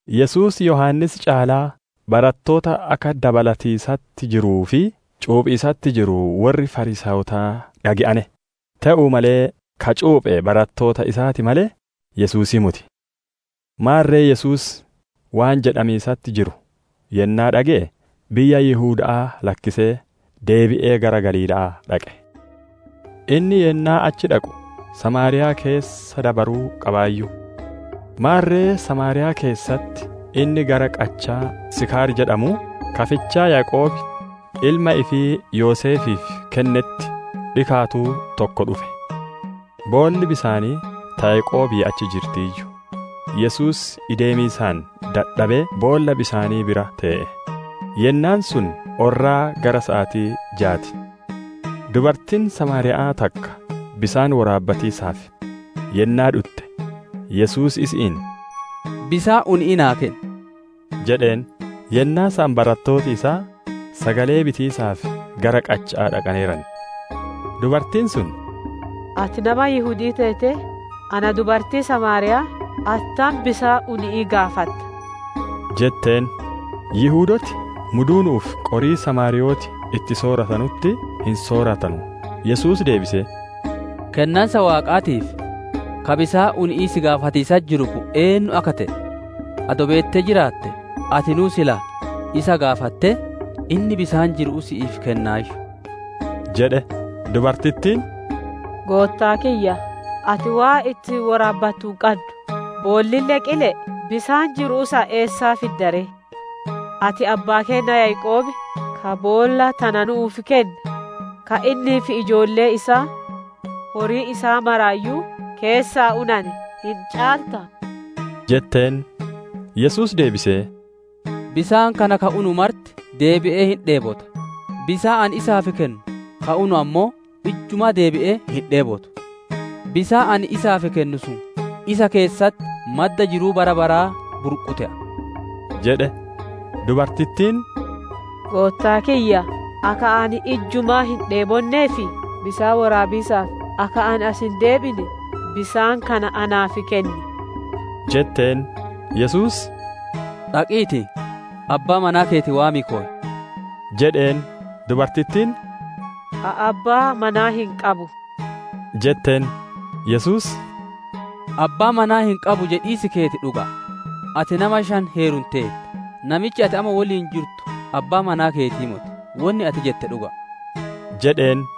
Yesuus Yohaannis caalaa barattoota akka dabalatiisatti jiruu fi cuuphiisatti jiru worri Fariisaayotaa dhage'ane. Te'uu malee, ka cuuphe barattoota isaa ti malee, Yesuusii moti. Maarre Yesuus waan jedhamiisatti jiru yennaa dhage'e, biyya Yihuda'aa lakkisee deebi'ee gara Galiila'aa dhaqe. Inni Yennaa achi dhaqu Samaariyaa keessa dabaruu qabaayyu. Maarre Samaariyaa keessatti inni gara qachaa Siikaar jedhamuu, ka fichaa Yaaqoob ilma ifii Yoseefiif kennetti dhikaatuu tokko dhufe. Boolli bisaanii ta Yaaqoobii achi jirtiiyyu; Yesuus ideemiisaan dadhabee boolla bisaanii bira tee'e. Yennaan sun orraa gara saatii jaa ti. Dubartiin Samaariya'aa takka bisaan woraabbatiisaaf yennaa dhutte, Yesuus isi'iin, «Bisaan uni'ii naa kenni!» jedheen. Yennaa san barattooti isaa sagalee bitiisaaf gara qacha'aa dhaqaneeran. Dubartiin sun, «Ati nama Yihudi'ii teetee ana dubartii samaariya'aa attam bisaan uni'ii gaafatta?» jetteen. Yihudooti muduunu'uu fi qorii samaariyooti itti sooratanutti hin sooratanu. Yesuus deebisee, «Kennansa Waaqaatii fi ka bisaan uni'ii si gaafatiisatti jiru kun eennu akka te'e adoo beettee jiraattee, atinuu silaa isa gaafattee, inni bisaan jiru'uu si'iif kennaayyu» jedhe. Dubartittiin, «Goottaa kiyya, ati waan ittiin woraabbattu hin qaddu; boollille qile'e; bisaan jiru'uu san eessaa fidda ree? Ati abbaa keenna Yaaqoob ka boolla tana nu'uuf kenne, ka innii fi ijoolleen isaa, horiin isaa maraayyuu keessaa unane, hin caaltaa?» jetteen. Yesuus deebisee, «Bisaan kana ka unu marti deebi'ee hin dheebota; bisaan ani isaaf kennu ka unu ammoo ijjumaa deebi'ee hin dheebotu. Bisaan ani isaaf kennu sun isa keessatti madda jiruu bara baraa burqu te'a» jedhe. Dubartittiin, «Goottaa kiyya, akka ani ijjumaa hin dheebonnee fi bisaan woraabiisaaf akka ani as hin deebine, bisaan kana naaf kenni» jetteen. Yesuus, «Dhaqiitii, abbaa manaa keeti waamii koy» jedheen. Dubartittiin, «Ani abbaa manaa hin qabu» jetteen. Yesuus, « ‹Abbaa manaa hin qabu› jedhiis keeti dhuga'a. Ati nama shan heerumteerta; namichi ati amma woliin jirtu abbaa manaa keetii moti. Wonni ati jette dhuga'a» jedheen.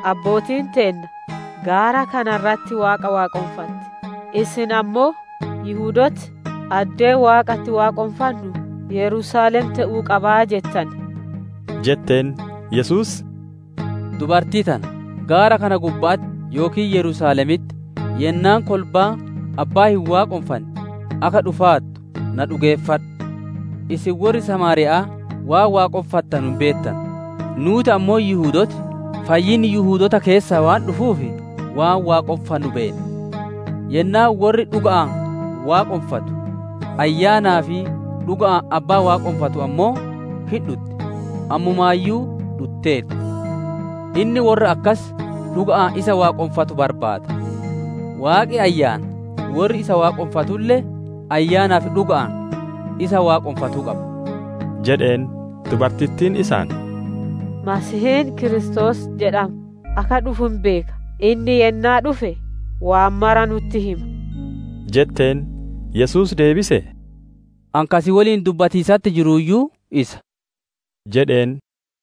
Abbootiin teenna gaara kana irratti Waaqa waaqonfatane; isin ammoo Yihudooti addeen Waaqa itti waaqonfannu Yerusaalem te'uu qaba jettan» jetteen. Yesuus, «Dubartii tana, gaara kana gubba'atti yookiin Yerusaalemitti yennaan kolbaan Abbaa hin waaqonfanne akka dhufaartu na dhugeeffadhu. Isin worri Samaariya'aa waan waaqonfattanu hin beettanu; nuuti ammoo Yihudooti fayyinni Yihudoota keessaa waan dhufuuf, waan waaqonfannu beenna. Yennaan worri dhuga'aan waaqonfatu, Ayyaanaa fi dhuga'aan Abbaa waaqonfattu ammoo hin dhutti; ammumaayyuu dhutteerti. Inni worra akkas dhuga'aan isa waaqonfatanu barbaada. Waaqi Ayyaana; worri isa waaqonfatulle Ayyaanaa fi dhuga'aan isa waaqonfatuu qaba» jedheen. Dubartittiin isaan, «Masiihiin Kiristoos jedhamu akka dhufu hin beeka; inni yennaa dhufe waan mara nu'utti hima» jetteen. Yesuus deebisee, «Ani ka si woliin dubbatiisatti jiruuyyuu isa» jedheen.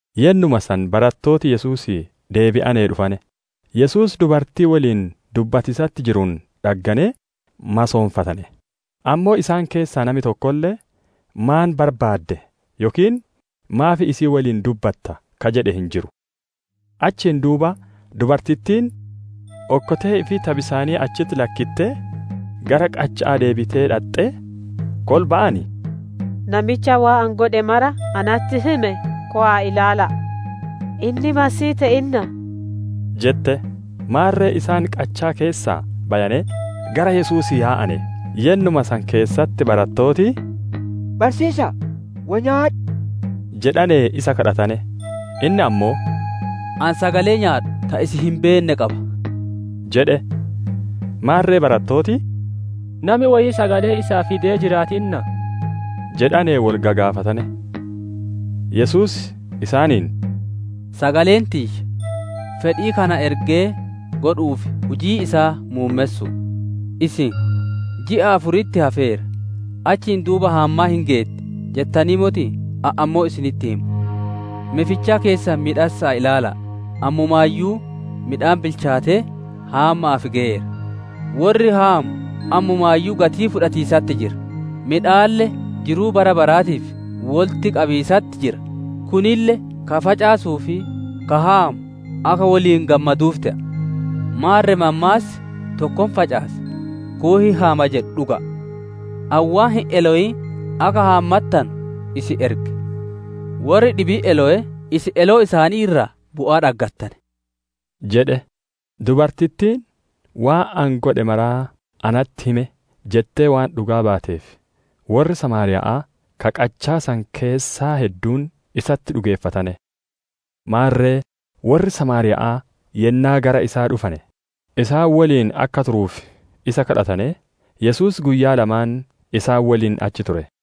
Yennuma san barattooti Yesuusii deebi'anee dhufane; Yesuus dubartii woliin dubbatiisatti jiruun dhagganee masoonfatane; ammoo isaan keessaa nami tokkolle, «Maan barbaadde?» yookiin, «Maaf isii woliin dubbatta?» ka jedhe hin jiru. Achiin duuba dubartittiin okkotee ifii ta bisaanii achitti lakkittee, gara qacha'aa deebitee dhaxxee, kolba'aan, «Namicha waan ani godhe mara natti hime kowa'aatii ilaala'a. Inni Masiihii te'innaa?» jette. Maarre isaan qachaa keessaa bayanee gara Yesuusii yaa'ane. Yennuma san keessatti barattooti, «Barsiisa'a, woy nyaadhu!» jedhanee isa kadhatane. Inni ammoo, «Ani sagalee nyaadhu ta isin hin beenne qaba» jedhe. Maarre barattooti, «Nami woyii sagalee isaa fidee jiraatinaa?» jedhanee wol gagaafatane. Yesuus isaaniin, «Sagaleen tiyya, fedhii ka na ergee godhu'uu fi hujii isaa muummessu'u. Isin, ‹Ji'a afuritti hafeera; achiin duuba haammaan hin geetti› jettanii motii? Ani ammoo isinitti hima; me fichaa keessan miidhassa'aa ilaala'a; ammumaayyuu midhaan bilchaatee haamma'aaf geyeera! Worri haamu ammumaayyuu gatii fudhatiisatti jira; midhaalle jiruu bara baraatiif wolitti qabiisatti jira; kunille ka facaasuu fi ka haamu akka woliin gammaduuf te'a. Maarre mammaassi, ‹Tokko hin facaasa, kuun hin haama› jedhu dhuga'a. Ani waan hin elowin akka haammattanu isin erge; worri dhibiin elowee, isin eloo isaanii irraa bu'aa dhaggattane» isaaniin jedhe. Dubartittiin, «Waan ani godhe mara natti hime» jettee waan dhugaa baateef worri Samaariya'aa ka qachaa san keessaa hedduun isatti dhugeeffatane. Maarre worri samaariya'aa yennaa gara isaa dhufane, isaan woliin akka turuuf isa gaafatanee, Yesuus guyyaa lamaan isaan woliin achi ture.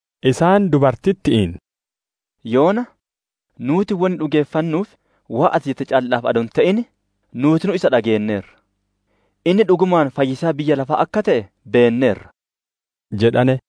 isaan dubartitti'iin, «Yoona nuuti wonni dhugeeffannuuf, waan ati jette calla'aaf adoo hin te'in, nuutinuu isa dhageenneerra; inni dhugumaan fayyisaa biyya lafaa akka te'e beenneerra» jedhane.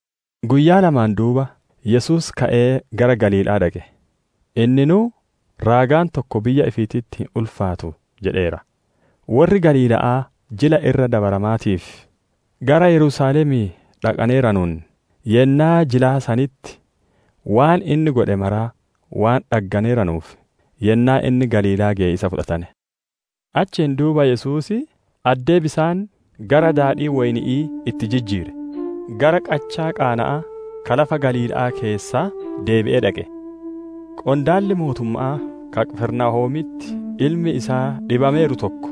Guyyaa lamaan duuba, Yesuus ka'ee gara Galiila'aa dhaqe. Inninuu, «Raagaan tokko biyya ifiititti hin ulfaatu» jedheera. Worri Galiila'aa Jila Irra Dabaramaatiif gara Yerusaalemii dhaqaneeranuun, yennaa jilaa sanitti waan inni godhe mara waan dhagganeeranuuf, yennaa inni Galiilaa geye isa fudhatane. Achiin duuba Yesuus, addee bisaan gara daadhii woyni'ii itti jijjiire, gara qachaa Qaana'aa ka lafa Galiila'aa keessaa, deebi'ee dhaqe. Qondaalli mootumma'aa ka Qifirnaahoomitti ilmi isaa dhibameeru tokko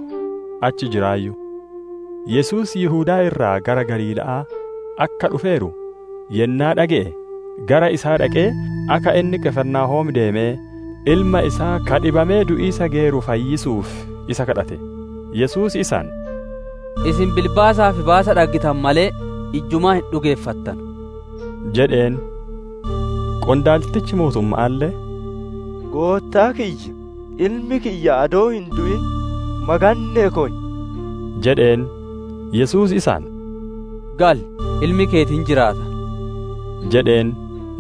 achi jiraayyu. Yesuus Yihudaa irraa gara Galiila'aa akka dhufeeru yennaa dhage'e, gara isaa dhaqee akka inni Qifirnaahoom deemee, ilma isaa ka dhibamee du'iisa geyeeru fayyisuuf isa gaafate. Yesuus isaan, «Isin bilbaasaa fi baasa dhaggittanu malee ijjumaa hin dhugeeffattanu» jedheen. Qondaaltichi mootumma'aalle, «Goottaa kiyya, ilmi kiyya adoo hin du'in maganne'ee koy!» jedheen. Yesuus isaan, «Gali; ilmi keeti hin jiraata!» jedheen.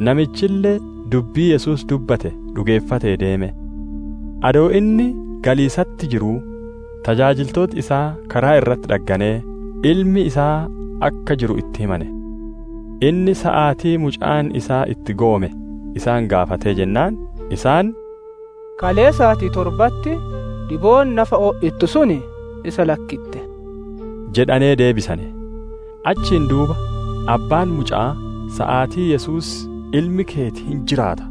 Namichille dubbii Yesuus dubbate dhugeeffatee deeme. Adoo inni galiisatti jiruu, tajaajiltooti isaa karaa irratti dhagganee, ilmi isaa akka jiru itti himane. Inni saatii mucaan isaa itti goome isaan gaafatee jennaan, isaan, «Kalee saatii torbatti dhibeen nafa o'ittu sun isa lakkitte» jedhanee deebisane. Achiin duuba abbaan muca'aa saatii Yesuus, «Ilmi keeti hin jiraata»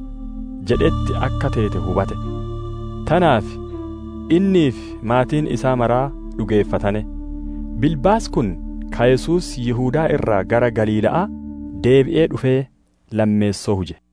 jedhetti akka teete hubate. Tanaaf innii fi maatiin isaa maraa dhugeeffatane. Bilbaasi kun ka Yesuus Yihudaa irraa gara Galiila'aa deebi'ee dhufee, lammeessoo huje.